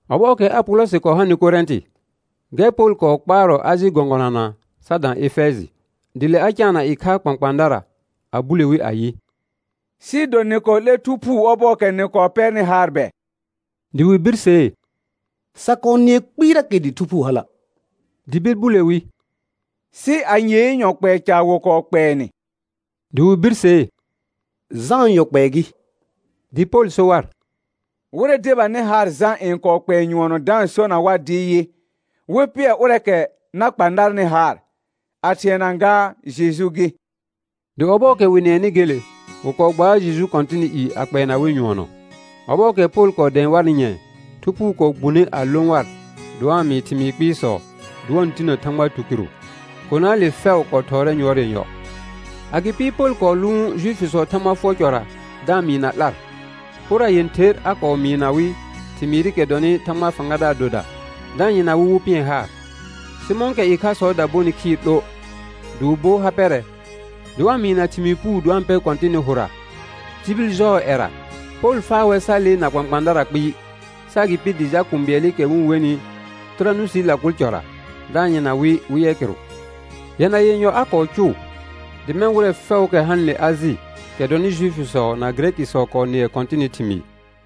Ɔbɔɔkɛ Apolɔsɩ kɔɔ hanɩ Korɛ̃tɩ, gɛr Pol kɔɔ kpaarɔ Ajɩ gɔ̃gɔnana sa dã Efɛjɩ. Dɩ le a caana ɩkhaa kpãkpãadara a bule wi ayɩ: Sɩɩ do nɩ kɔɔ 'lɛr Thu Phuu ɔbɔɔkɛ nɩ kɔɔ pɛrnɩ haar bɛ? Dɩ wɩ birsee: Sa kɔɔ nɩɛ kpɩɩrakɛ dɩ Thu Phuu hala'. Dɩ bir bule wi: Sɩ anyee yɔ kpɛɛ ca wɩ kɔɔ kpɛɛ nɩ? Dɩ wɩ birsee: Jãa yɔ kpɛɛ gɩ. Dɩ Pol so war: Wɩrɛ debanɩ haar Jã n kɔɔ kpɛɛ nyʋɔnɔ da-n sona war dɩ yɩ, wɩ pɩɛr ʋrɛɛkɛ na kpa narnɩ haar, a thɩɛna gaa Jeju gɩ. Dɩ ɔbɔɔkɛ wɩ nɩɛnɩ gele, wɩ kɔɔ gbaar Jeju Kɔ̃tɩnɩ i a kpɛɛna wɩ nyʋɔnɔ. Ɔbɔɔkɛ Pol kɔɔ dɛ̃ɛ warnɩ nyɛ̃ɛ, Thu Phuu kɔɔ gbune a lõ war dɩ wa-n mɩɩ thɩmɩɩ kpɩɩsɔ, dɩ wa-n tinə Thãgba tukɩrʋ. Konaale fɛʋ kɔɔ thɔɔrɛ yʋɔr yenyɔ. Agɩpɩ Pol kɔɔ lʋʋn Juifisɔɔ Thãgba fʋɔr cɔra da-n mɩɩ na 'lar. Pora yẽther a kɔɔ mɩɩna wɩ thɩmɩɩrɩkɛ dɔnɩ Thãgbaa fãgadaar doda, da-n yɩrna wɩ wɩ pɩɛr haar. Sɩ mɔ̃kɛ ɩkhasɔɔda bonɩ khɩɩr 'lo dɩ wɩ bo ha pɛrɛ, dɩ wa-n mɩɩna thɩmɩɩ puu dɩ wa-n pɛr Kɔ̃tɩnɩ hʋra tibil jɔɔ ƴɛra, Pol faa wɛr sa lee na kpãkpãadara kpɩɩ, sɩ agɩpɩ dɩ jal kũu bɩɛlɩkɛ wɩ-n wenɩ Tɩranusii lakol cɔra da-n yɩrna wɩ wɩ yɛ kɩrʋ. Yɛna yenyɔ a kɔɔ cʋʋ, dɩ mɛ̃ wɩrɛ fɛʋʋkɛ hanɩle Ajɩ, kɛ dɔnɩ Juifisɔ na Gɩrɛkɩsɔ kɔɔ nɩɛ Kɔ̃tɩnɩ thɩmɩɩ.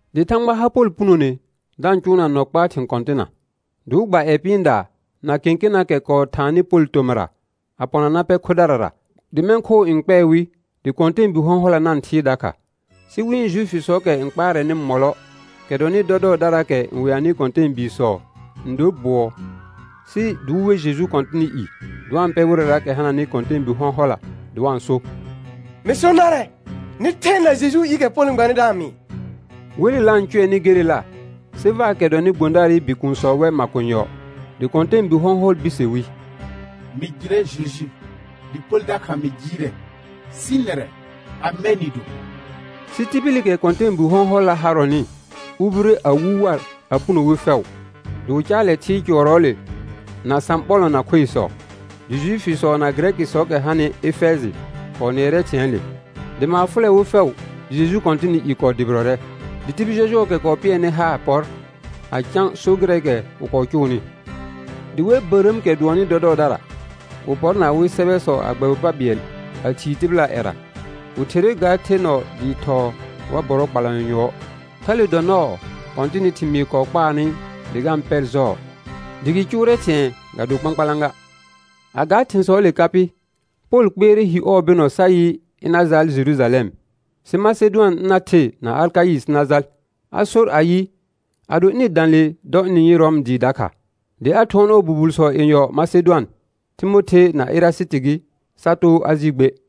Dɩ Thãgba har Pol punone da-n cʋʋna nɔ kpaa thɩ̃ kɔ̃tɩna. Dɩ wɩ gba ƴɛ pɩɩndaa na kẽkenaakɛ kɔɔ thaanɩ Pol tomɩra, a pɔna na pɛr khodarara; dɩ mɛ̃ khoo n kpɛɛ wɩ dɩ kɔ̃tɛɛbi hɔ̃hɔla na-n thɩɩr dakha. Sɩ wɩ̃ Juifisɔɔkɛ n kpaarɛnɩ mɔlɔ, kɛ dɔnɩ dɔdɔɔdaraakɛ n wɛanɩ kɔ̃tɛɛbiisɔ n dor bʋɔ, sɩ dɩ wɩ we Jeju Kɔ̃tɩnɩ i dɩ wa-n pɛ wɩrɛraakɛ hananɩ kɔ̃tɛɛbi hɔ̃hɔla dɩ wa-n so: Mɩ so narɛ, nɩ thɛ na Jejuu iikɛ Pol n gbanɩ da-n mɩɩ. Welela n cʋɛnɩ gelela, Sevaakɛ dɔnɩ gbõdaarɩ bikuunsɔ wɛ makonyɔ. Dɩ kɔ̃tɛɛbu hɔ̃hɔl birse wi: Mɩ jɩrɛ Jeju, dɩ Pol dakha mɩ jɩɩrɛ, sɩ nɛrɛ, amɛ nɩ do? Sɩ tibilikɛ kɔ̃tɛɛbu hɔ̃hɔlla harɔnɩ ubire a wu war a puno wi fɛʋ, dɩ wɩ caalɛ thɩɩr cʋɔrɔɔle na sãɓɔlɔ̃ na khoisɔ. Dɩ Juifisɔ na Gɩrɛkɩsɔɔkɛ hanɩ Efɛjɩ kɔɔ nɩɛrɛ thɩ̃ɛɛle, dɩ maar fʋlɛ wɩ fɛʋ dɩ Jeju Kɔ̃tɩnɩ i kɔɔ dʋbɩrɔrɛ. Dɩ tibil jɔjʋɔɔkɛ kɔɔ pɩɛrnɩ haar pɔr a cã so gɩrɛɛkɛ wɩ kɔɔ cʋʋnɩ. Dɩ wɛ bərəəmkɛ dʋɔnnɩ dɔdɔɔdara, wɩ pɔr na awɩ sɛbɛsɔ, a gbɛbɩ pa bɩɛl a thii tɩbɩlaa ƴɛra. Wɩ therre ga the nɔ dɩɩ thɔɔ war bɔrɔ kpalanyɔ yʋɔr. Thale dɔ nɔɔ Kɔ̃tɩnɩ thɩmɩɩ kɔɔ kpaarnɩ dɩ ga-n pɛr jɔɔ, dɩ gɩ cʋʋrɛ thɩ̃ɛ ga do kpãkpalã ga. A ga thɩ̃sɔɔle ka pɩ, Pol kpɩɛrɛ hi ɔɔ bɩnɔ sa yɩ, ɩna jaal Jerujalɛm, sɩ Masedʋan ɩna the na Akaɩ sɩ na jal. A sor ayɩ, ado ɩnɩ dã le dɔ ɩnɩ-n yɩ Rɔm dɩɩ dakha. Dɩ a thʋɔn ɔɔ bubulsɔ yenyɔ Masedʋan, Timothe na Erasɩtɩ gɩ, sa too Ajɩ gbe.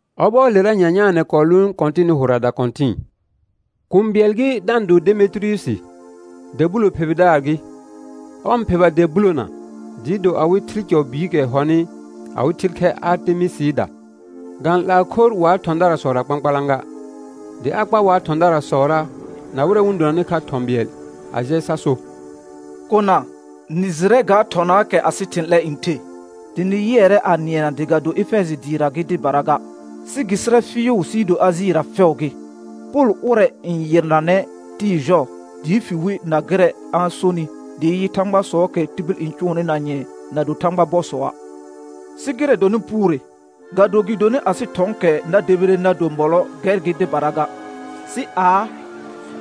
Ɔbɔɔlera nyanyaanɛ kɔɔ lʋʋn Kɔ̃tɩnɩ hʋra dakɔ̃tɩ̃ɩ. Kũu bɩɛl gɩ da-n do Demetiriyusi, dɛ bulo phebɩdaar gɩ; ɔr n pheba dɛ bulona dɩɩ do awɩ thɩl cɔ biikɛ hɔnɩ awɩ thɩl khɛr Artemɩsɩɩda, ga-n 'laa khor wa thɔ̃darasɔra kpãkpalã ga. Dɩ a kpar wa thɔ̃darasɔra, na wɩrɛ wɩ-n donanɩ kha thɔ̃ bɩɛl a jɛ sa so: Kona, nɩ jɩrɛ ga thɔnaakɛ asɩ thɩ̃ 'lɛ n the, dɩ nɩ yɩɛrɛ a nɩɛna dɩ ga do Efɛjɩ dɩɩra gɩ dɩbara ga, sɩ gɩ sɩrɛ fɩɩʋ sɩɩ do Ajɩra fɛʋ gɩ, Pol ʋrɛ n yɩrnanɛ tɩɩ jɔɔ dɩ fi wi na gɩrɛ a-n sonɩ dɩ yɩ, thãgbasɔɔkɛ tibil n cʋʋnɩ na nyɛ̃ɛ na do thãgba bɔsɔa'. Sɩ gɩrɛ dɔnɩ puure, ga do gɩdonɩ asɩ thɔ̃ɔkɛ na debire na do mɔlɔ gɛr gɩ dɩbara ga, sɩ aa: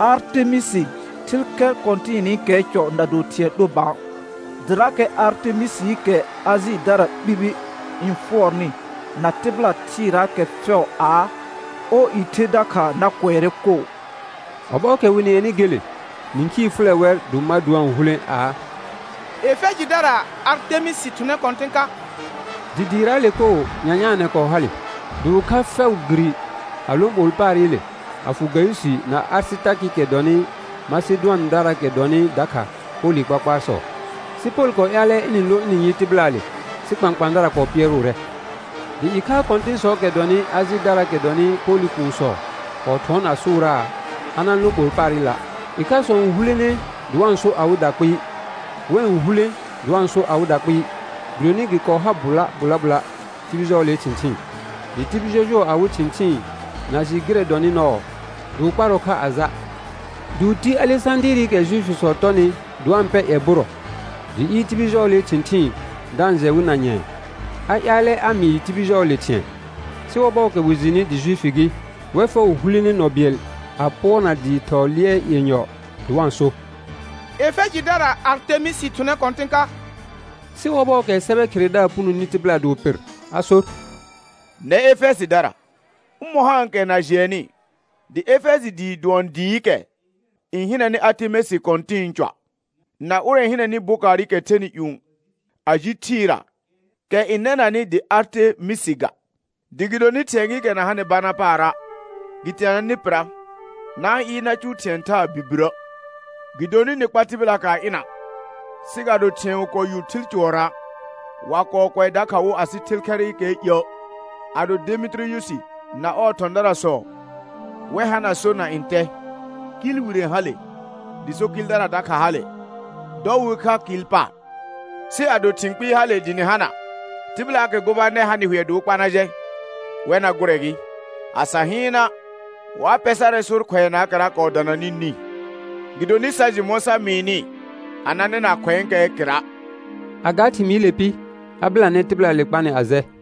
Artemɩsɩ, thɩl khɛ kɔ̃tɩnɩkɛɛ cɔ na do thɩ̃ɛ 'lo bã, dɩrakɛ Artemɩsɩɩkɛ Ajɩdara ɓibi n fʋɔrnɩ na tɩbɩla thɩɩraakɛ fɛʋ aa, ɔɔ i the dakha na kʋɛrɛ koo. Ɔbɔɔkɛ wɩ nɩɛnɩ gele, nĩkhii fʋlɛ wɛr dɩ wɩ ma dɩ wa-n hulẽ aa: Efɛjɩdaraa Artemɩsɩ thʋnɛ kɔ̃tɩ̃ ka. Dɩ dɩɩraale koo nyanyaanɛ kɔɔ hale. Dɩ wɩ kha fɛʋ giri a lõ ɓol paarɩle a fʋ Gayʋsɩ na Arɩsɩtarkɩ, kɛ dɔnɩ Masedʋandaraakɛ dɔnɩ dakha Polɩ kpakpaarsɔ. Sɩ Pol kɔɔ ƴaalɛ ɩnɩ-n lõ ɩnɩ-u yɩ tɩbɩlaale, sɩ kpãkpãadara kɔɔ pɩɛrʋʋrɛ. Dɩ ɩkha kɔ̃tɩ̃sɔɔkɛ dɔnɩ Ajɩdaraakɛ dɔnɩ Polɩ kuunsɔ kɔɔ thʋɔn a sʋʋraa, a na-n lõ ɓol paarɩla'. Ɩkhasɔ n hulene dɩ wa-n so awɩda kpɩɩ, wɛ n hulẽ dɩ wa-n so awɩda kpɩɩ, gɩdonɩ gɩ kɔɔ har bʋla bʋla bʋla tibil jɔɔlee thɩ̃thɩɩn, dɩ tibil jɔjʋɔ awɩ thɩ̃thɩɩn na jɩ gɩrɛ dɔnɩ nɔɔ dɩ wɩ kparɔ kha a ja'. Dɩ wɩ ti Alesãdɩɩrɩkɛ Juifisɔ tɔnɩ dɩ wa-n pɛr ƴɛ bʋrɔ, dɩ ɩɩr tibil jɔɔlee thɩ̃thɩɩn da-n jɛ wɩ na nyɛ̃ɛ, a ƴaalɛ a mɩɩ tibil jɔɔlee thɩ̃ɛ. Sɩ ɔbɔɔkɛ wɩ jɩnɩ dɩ Juifi gɩ, wɛr fɛʋ hulene nɔ bɩɛl a pʋɔrna dɩɩ thɔɔ lɩɛr yenyɔ dɩ wa-n so: Efɛjɩdaraa Artemɩsɩ thʋnɛ kɔ̃tɩ̃ ka. Sɩ ɔbɔɔkɛ sɛbɛ kheredaar punoni tɩbɩla dɩ wɩ pɩr, a sor: Nɛr Efɛjɩdara, ʋmɔ̃ haankɛ na jɩɛnnɩ dɩ Efɛjɩ dɩɩ dʋɔn dɩɩkɛ n hɩnɛnɩ Artemɩsɩ kɔ̃tɩ̃ɩ cɔa', na ʋrɛ n hɩnɛnɩ bokaarɩkɛ thɛnɩ ƴũ a ji thɩɩra kɛ n nɛnanɩ dɩ Artemɩsɩ ga. Dɩ gɩdonɩ thɩ̃ɛ gɩɩkɛ na hanɩ bana paara' gɩ teenanɛ nɩ pɩra, na-n ɩɩr na cʋʋ thɩ̃ɛ thaa birbirə'. Gɩdonɩ nɩ kpar tɩbɩlaakɛ a ɩna, sɩ ga do thɩ̃ɛ wɩ kɔɔ yu thɩl cʋɔrɔa', wa kɔɔ kʋɛ dakha wo asɩ thɩl khɛrɩkɛɛ iə'. Ado Demetiriyusi na ɔɔ thɔ̃daarsɔ wɛr hana sor na ntɛ, kɩɩl wire hale dɩ so kɩɩldara dakha hale, dɔ wɩ we kha kɩɩl paar. Sɩ ado thɩ̃ kpɩɩ hale dɩ nɩ hana, tɩbɩlaakɛ gobanɛr hanɩ hʋɛ dɩ wɩ kpa na jɛ, wɛr na gʋrɛ gɩ. A sa hɩɩna', wa pɛ sarɛ sor khʋɛnaakɛra kɔɔ dananɩ nĩ, gɩdonɩ sa jɩ mɔ̃ sa mɩɩnɩ a na nɩna khʋ̃ɛɛkɛɛ kɩra'. A ga thɩmɩɩle pɩ, a bɩlanɛ tɩbɩlaale kpanɩ a jɛ.